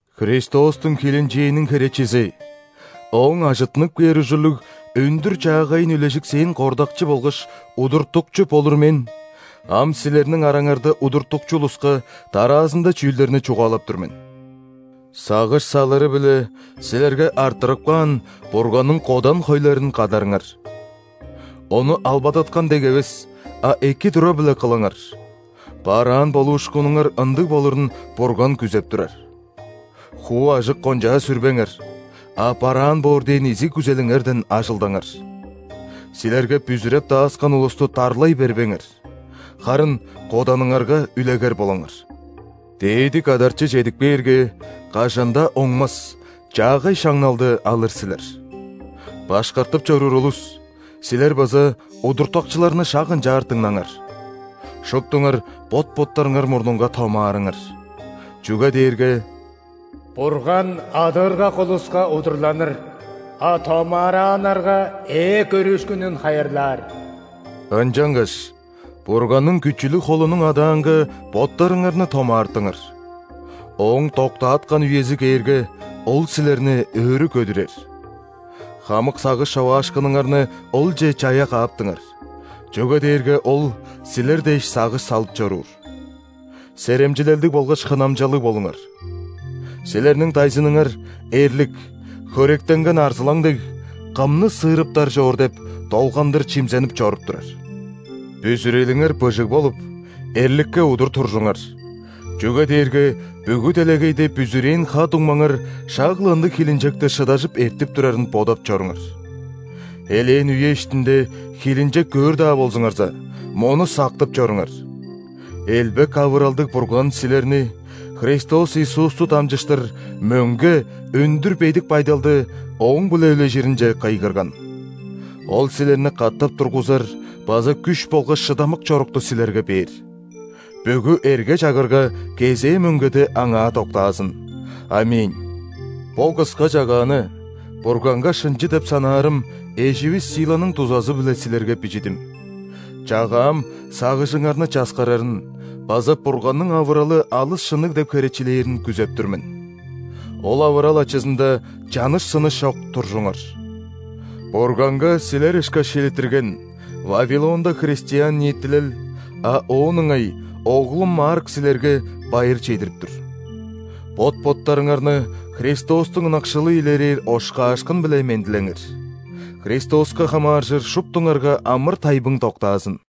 Христостуң хилинчээниң херечизи, Ооң ажыттынып кээр ужурлуг өндүр-чаагайын үлежиксээн кордакчы болгаш удуртукчу болур мен ам силерниң араңарда удуртукчу улуска дараазында чүүлдерни чугаалап тур мен. Сагыш салыры-биле силерге арттырып каан Бурганның кодан хойларын кадарыңар. Ону албадаткан дег эвес, а эки тура-биле кылыңар – бараан болуушкунуңар ындыг болурун Бурган күзеп турар. Хуу ажык-кончаа сүрбеңер, а бараан боор дээн изиг күзелиңерден ажылдаңар. Силерге бүзүреп дааскан улусту дарлай бербеңер, харын коданыңарга үлегер болуңар. Дээди Кадарчы чедип кээрге, кажан-даа оңмас чаагай шаңналды алыр силер Башкартып чоруур улус, силер база удуртукчуларны шак ынчаар дыңнаңар. Шуптуңар бот-боттарыңар мурнунга томаарыңар, чүге дээрге«Бурган адыыргак улуска удурланыр,а томаарааннарга ээ көрүүшкүнүн хайырлаар». Ынчангаш Бурганның күчүлүг холунуң адаанга боттарыңарны томаартыңар, Ооң доктааткан үези кээрге, Ол силерни өрү көдүрер. Хамык сагыш човаашкыннарыңарны Олче чая кааптыңар, чүге дээрге Ол силер дээш сагыш салып чоруур. Серемчилелдиг болгаш хынамчалыг болуңар. Силерниң дайзыныңар – эрлик, хөректенген арзылаң дег, «Кымны сыырыптар чоор» деп, долгандыр чимзенип чоруп турар. Бүзүрелиңер быжыг болуп, эрликке удур туржуңар, чүге дээрге бүгү делегейде бүзүрээн ха-дуңмаңар шак-ла ындыг хилинчекти шыдажып эртип турарын бодап чоруңар. Элээн үе иштинде хилинчек көөр-даа болзуңарза, мону сактып чоруңар: элбек авыралдыг Бурган силерни Христос Иисусту дамчыштыр мөңге өндүр бедик байдалды Ооң-биле үлежиринче кыйгырган. Ол силерни катап тургузар база күш болгаш шыдамык чорукту силерге бээр. Бүгү эрге-чагырга кезээ мөңгеде Аңаа доктаазын! ·Аминь. Бо кыска чагааны Бурганга шынчы деп санаарым эживис Силаның дузазы-биле силерге бижидим. Чагаам сагыжыңарны часкарарын база Бурганның авыралы алыс шынныг деп херечилээрин күзеп тур мен. Ол авырал ачызында чаныш-сыныш чок туржуңар! Бурганга силер ышкаш шилиттирген Вавилонда христиан ниитилел, а оон ыңай оглум Марк силерге байыр чедирип тур. Бот-боттарыңарны Христостуң ынакшылы илерээр ошкаашкын-биле мендилеңер. Христоска хамааржыр шуптуңарга амыр-тайбың доктаазын!